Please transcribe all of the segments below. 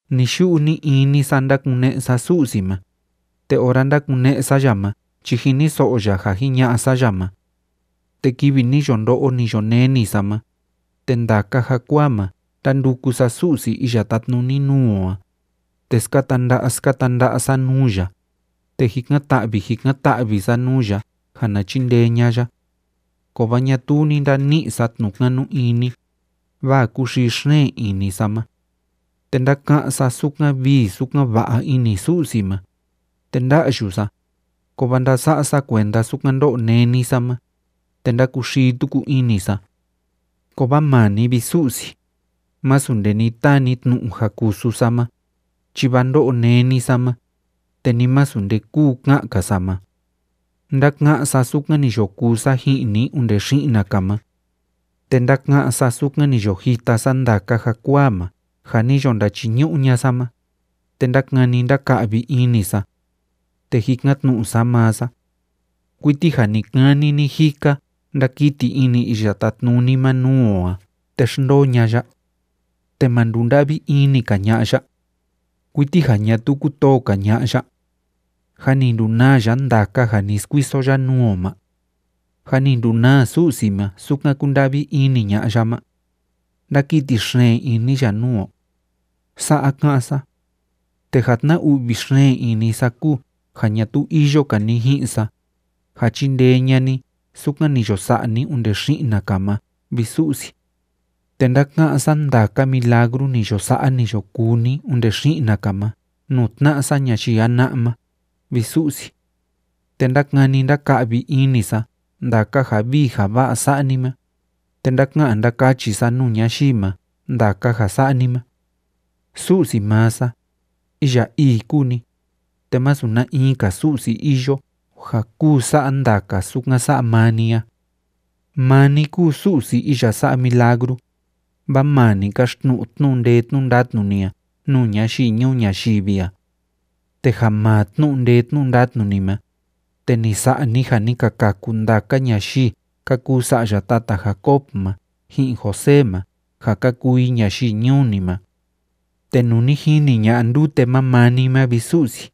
Ni‑yu'u ni‑ini sa ndákune'e sa Su'si ma, te ora ndákune'e sa ya ma chi jiniso'o ya ja jiña'a sa ya ma. Te kivi ni yo ndo'o, ni yo neni sa ma, te ndaka jakuaa ma ndánduku sa Su'si iya tátnuni nuu o a, te skata nda'a skata nda'a sa nuu ya, te jikan‑ta'vi jikan‑ta'vi sa nuu ya ja na chindee ña'a ya. Kovaa ñatuu ni ndani'i sa tnu'u kanu ini, vaa kúxii xeen ini sa ma. Te ndáka'án sa sukan vii sukan va'a ini Su'si ma, te nda'yu sa, kovaa ndása'a sa kuenda sukan ndó'o néni sa ma, te ndákuxii tuku ini sa. Kovaa maa ni, vi Su'si, másu nde ni taa ni tnu'u ja kusu sa ma, chi vaa ndó'o néni sa ma, te ni masu nde kúu ka'an‑ka sa ma. Ndáka'án sa sukan ni yo kuu sa ji'in ni onde xi'na‑ka ma. Te ndáka'án sa sukan ni yo jita sa ndaka jakuaa ma ja ni yo ndachiñu'u ña'a sa ma, te ndákani ndáka'vi ini sa. Te jikan‑tnu'u sa maa sa: “¿Kuiti ja ni‑kani ni‑jika ndakiti ini Iya Tátnuni ma nuu o a te xndoo ña'a ya? ¿Te ma ndunda'vi ini‑ka ña'a ya? ¿Kuiti ja ñatuu kútoo‑ka ña'a ya? ¿Jâ ni ndunaa ya ndaka ja ni skuiso ya nuu o ma? ¿Jâ ni ndunaa Su'si ma sukan kúnda'vi ini ña'a ya ma? ¿Ndákiti xeen ini ya nuu o?”, Sa'a ka'án sa. Te ja tna‑u'vi xeen ini sa kúu ja ñatuu iyo‑ka ni ji'in sa, ja chindee ña'a ni sukan ni yo sa'a ni onde xi'na‑ka ma, vi Su'si. Te ndáka'án sa ndaka milagru ni yo sa'a, ni yo kuu ni onde xi'na‑ka ma nuu tna'a sa ñayii jana'a ma, vi Su'si. Te ndákani ndáka'vi ini sa ndaka ja vii ja va'a sa'a ni ma, te ndáka'an ndákachi sa nuu ñayii ma ndaka ja sa'a ni ma. Su'si maa sa, iya ii kúu ni, te masu na in‑ka su'si iyo ja kuu sa'a ndaka sukan sa'a maa ni a. Maa ni kúu Su'si iya sa'a milagru, vaa maa ni káxtnu'u tnu'u ndee tnu'u ndatnu ni a nuu ñayii ñuu ñayivi a. Te ja maa tnu'u ndee tnu'u ndatnu ni ma, te ni sa'a ni ja ni ka kaku ndaka ñayii ka kuu sa'ya tata Jacob ma ji'in José ma ja ka kuu i ñayii ñuu ni ma. Te nuu ni jini ña'a ndute ma maa ni ma, vi Su'si,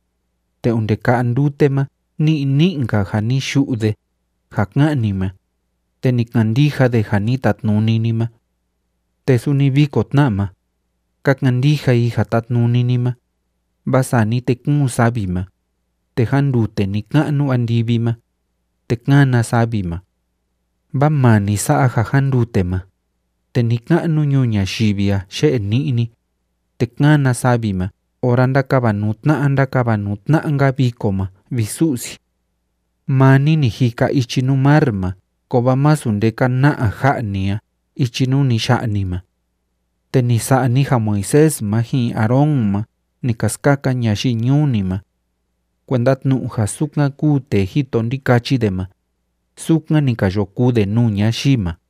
te onde ka'a ndute ma ní'i ní'i‑nka ja ni yu'u de ja ká'an ni ma, te ni kandija de ja ni tatnuni ni ma. Te suni viko tna ma, ka kandija i ja tátnuni ni ma, vaa sani te kúun savi ma, te jándute ni‑ka'nu andivi ma, te kána savi ma. Vaa maa ni sa'a ja jándute ma, te ni‑ka'nu ñuu ñayivi a yé'e ni'ni, te kána savi ma ora ndákavanuu tna'a ndákavanuu tna'a‑nka viko ma, vi Su'si. Maa ni ni jika ichi nuu mar ma kovaa masu nde ka na'a ja'a ni a ichi nuu ni ya'a ni ma. Te ni sa'a ni ja Moisés ma ji'in Aarón ma ni ka skaka ñayii ñuu ni ma. Kuenda tnu'u ja sukan kúu tee jito ndikachi de ma, sukan ni ka yo kuu de nuu ñayii ma.